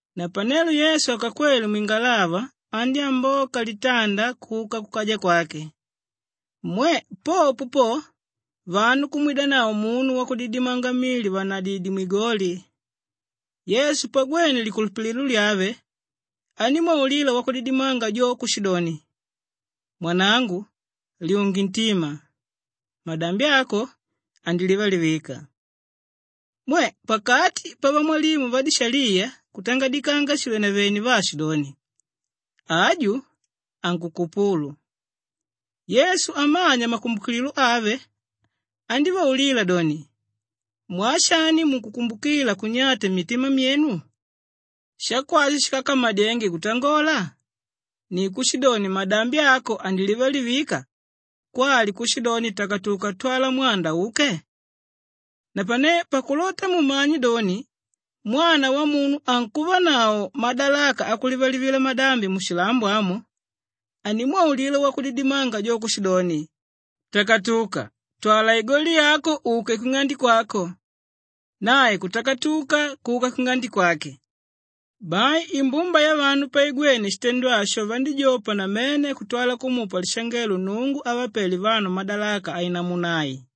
Napanelo Yesu akakwele mwingalava, andyámboka litanda kuka kukaja kwake. Mwe! Popo po, vanu kumwidanavo munu wakudidimanga mili vànadidye mwigoli. Yesu pagwene likulupililo lyave, andímwaulila wakudidimanga jo kushidoni, “Mwanangu lyunge ntima! Madambi ako andilivalivika.” Mwe! Pakati pavamwalimu vadishaliya kutangadikanga shivenevene vaashidoni, “Aju ankukupulu.” Yesu amanya makumbukililo ave andívaulila doni, “Mwaa shani munkukumbukila kunyata mmitima myenu? Shakwashi shíkakamadyenge kutangola? Ni kushidoni, ‘Madambi ako andilivalivika,’ kwali kushidoni, ‘Takatuka twala mwanda uke’? Napane pakulota mumanye doni, Mwana Wamunu ankuvanavo madalaka akulivalivila madambi mushilambo amu…” andímwaulila wakudidimanga jo kushidoni, “Takatuka! Twala igoli yako uke kwing'ande kwako.” Nae kutakatuka kuka kwing'ande kwake. Bai imbumba yavanu paigwene shitendo asho vandíjopa namene kutwala kumupa lishangelo Nnungu ávapele vanu madalaka ainamuna ai.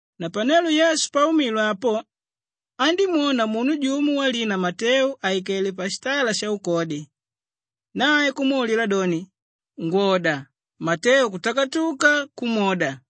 Napanelo Yesu paumile apo andímwona munu jumo walina Mateu àikele pashitala shaukodi. Nae kumwaulila doni, “Ngwoda!” Mateu kutakatuka kumwoda.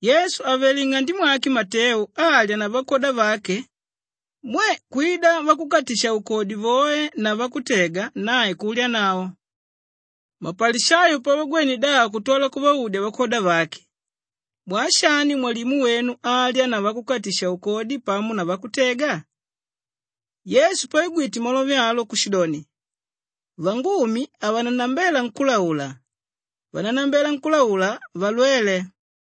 Yesu àvele nng'ande mwake Mateu alya na vakwoda vake, mwe! Kwida vakukatisha-ukodi voe na vakutega, nae kulyanavo. Mapalishayo pavagwene davo kutwala kuvaudya vakwoda vake, “Mwaa shani mwalimu wenu alya na vakukatisha-ukodi pamo na vakutega?” Yesu paigwite malove alo kushidoni, “Vangumi havanannambela nkúlaula. Vanánnambela nkúlaula, valwele.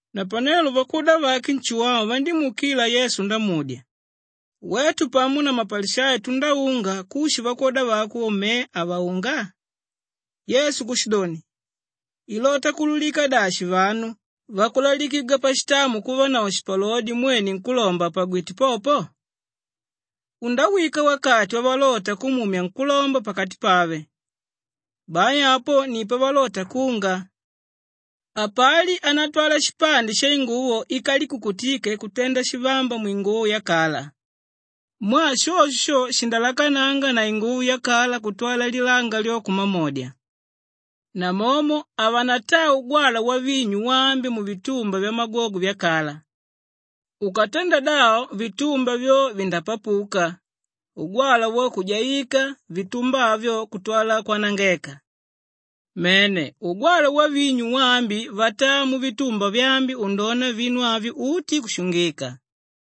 Napanelo vakwoda vake Nshuwau vandímuukila Yesu ndamudya, “Wetu pamo na mapalishayo tundáunga, kushi vakwoda vako me havanaunga?” Yesu kushidoni, “Ilota kuulukika dashi vanu vakulalikigwa pashitamu kuvanavo shipalodi mwene nkúlomba àpagwite popo? Undawika wakati wavalota kumumya nkúlomba pakati pave. Bai apo ni pavalota kunga. Hapali ánatwala shipande shainguvo íkalikukutike kutenda shivamba mwinguvo yakala. Mwaa shosho sho shindalakananga na inguvo yakala kutwala lilanga lyo kumamodya. Namomo havanataa ugwalwa wavinyu waambi muvitumba vyamagwogwe vyakala. Ukatenda davo vitumba vyo vindapapuka, ugwalwa wo kujaikanga, vitumba avyo kutwala kwanangeka. Mene, ugwalwa wavinyu waambi vataa muvitumba vyaambi undona vinu avyo uti, kushungika.”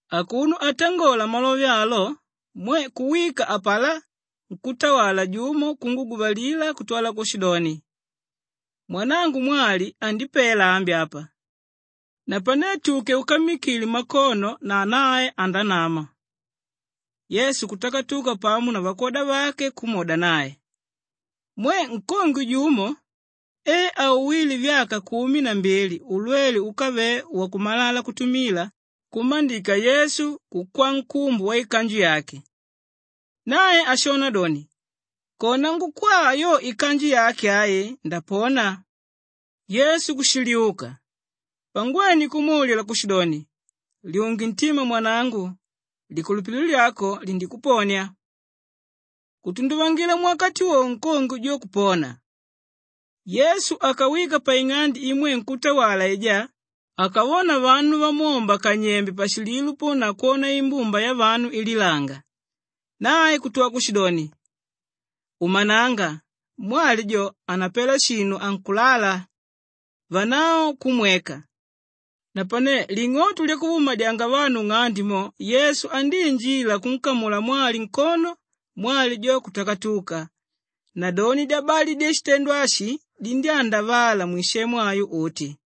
Akuno atangola malove alo, mwe! Kuwika apalá nkútawala jumo kunguguvalila kutwala kushidoni, “Mwanangu mwali andipela ambi apa. Napane tuke ukammikile makono na nae andanama!” Yesu kutakatuka pamo na vakwoda vake kumwoda nae. Mwe! Nkongwe jumo e auwíle vyaka kumi na mbili ulwele úkavele wakumalala kutumila kummandika Yesu, kukwaa nkumbu waikanju yake. Nae ashona doni, “Kona ngukwaa yo ikanju yake ai, ndapona.” Yesu kushiliuka. Pangwene, kumwaulila kushidoni, “Lyunge ntima mwanangu. Likulupililo lyako lindikuponia.” Kutunduvangila muwakati wowo nkongwe jo kupona. Yesu akawika paing'ande imwe nkútawala aijá, akavona vanu vamwomba kanyembe pashililo po na kwona imbumba yavanu ililanga. Nae kutwala kushidoni, “Umananga, mwali jo hanapela shinu ankulala.” Vanavo kumweka. Napane ling'oto lyakuvaumadyanga vanu nng'ande mo, Yesu andíinjila kunkamula mwali nkono, mwali jo kutakatuka. Nadoni dyabali dyashitendo ashi dindyándavala mwisemu ayo uti.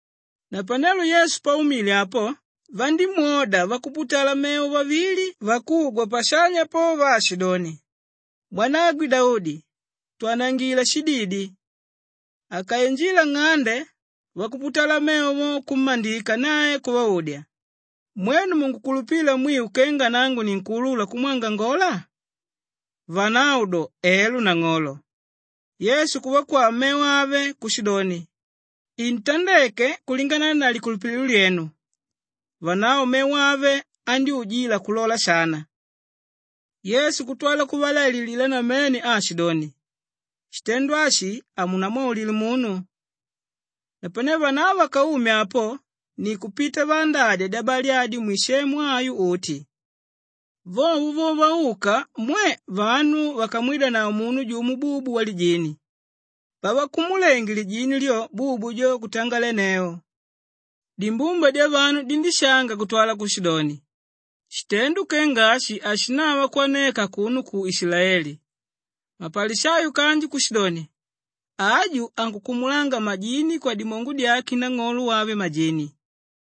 Napanelo Yesu paumile apo, vandímwoda vakuputala mevo vavili vakugwa pashanya po vaashidoni, “Mwanagwe Daudi, twanangila shididi!” Akainjila nng'ande, vakuputala mevo vo kummandika nae kuvaudya, “Mwenu munkukulupila mwiu kenga nangu ninkuulula kumwangangola?” Vanavo do, “Elo nang'olo.” Yesu kuvakwaa mevo ave kushidoni, “Intandeke kulingana na likulupililo lyenu.” Vanavo mevo ave andyújila kulola shana. Yesu kutwala kuvalaililila namene aashidoni, “Shitendo ashi hamunamwaulile munu.” Napane vanavo vakaume apo ni kupita vaandadya dyabali adyo mwisemu ayo uti. Vovo vo vauka, mwe! Vanu vakamwidanavo munu jumo bubu walijini. Pavakumulenge lijini lyo, bubu jo kutangolenneu. Dimbumba dyavanu dindíshanga kutwala kushidoni, “Shitendo kenga ashi hashinava kwaneka akuno ku Ishilaeli!” Mapalishayo kanji kushidoni, “Aju ankukumulanga majini kwadimongo dyake nang'olo wave majini.”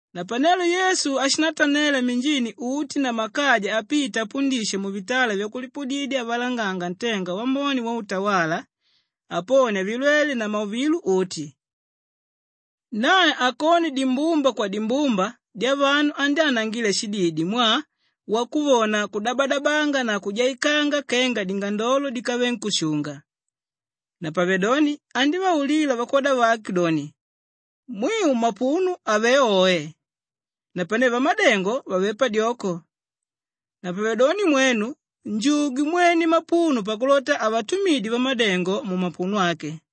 Napanelo Yesu ashindatanela minjini uti na makaja apita apundisha muvitala vyakulipudidya avalanganga ntenga wambone wautawala, aponia vilwele na mauvilo uti. Nae akone dimbumba kwadimbumba dyavanu andyánangila shididi mwaa wakuvona kudabadabanga na kujaikanga kenga dingandolo díkave nkúshunga. Napavedoni andívaulila vakwoda vake doni, “Mwiu mapuno avé oe napane vamadengo vavé padyoko. Napavedoni mwenu njugwe mwene mapuno pakulota avatumidye vamadengo mumapuno ake.”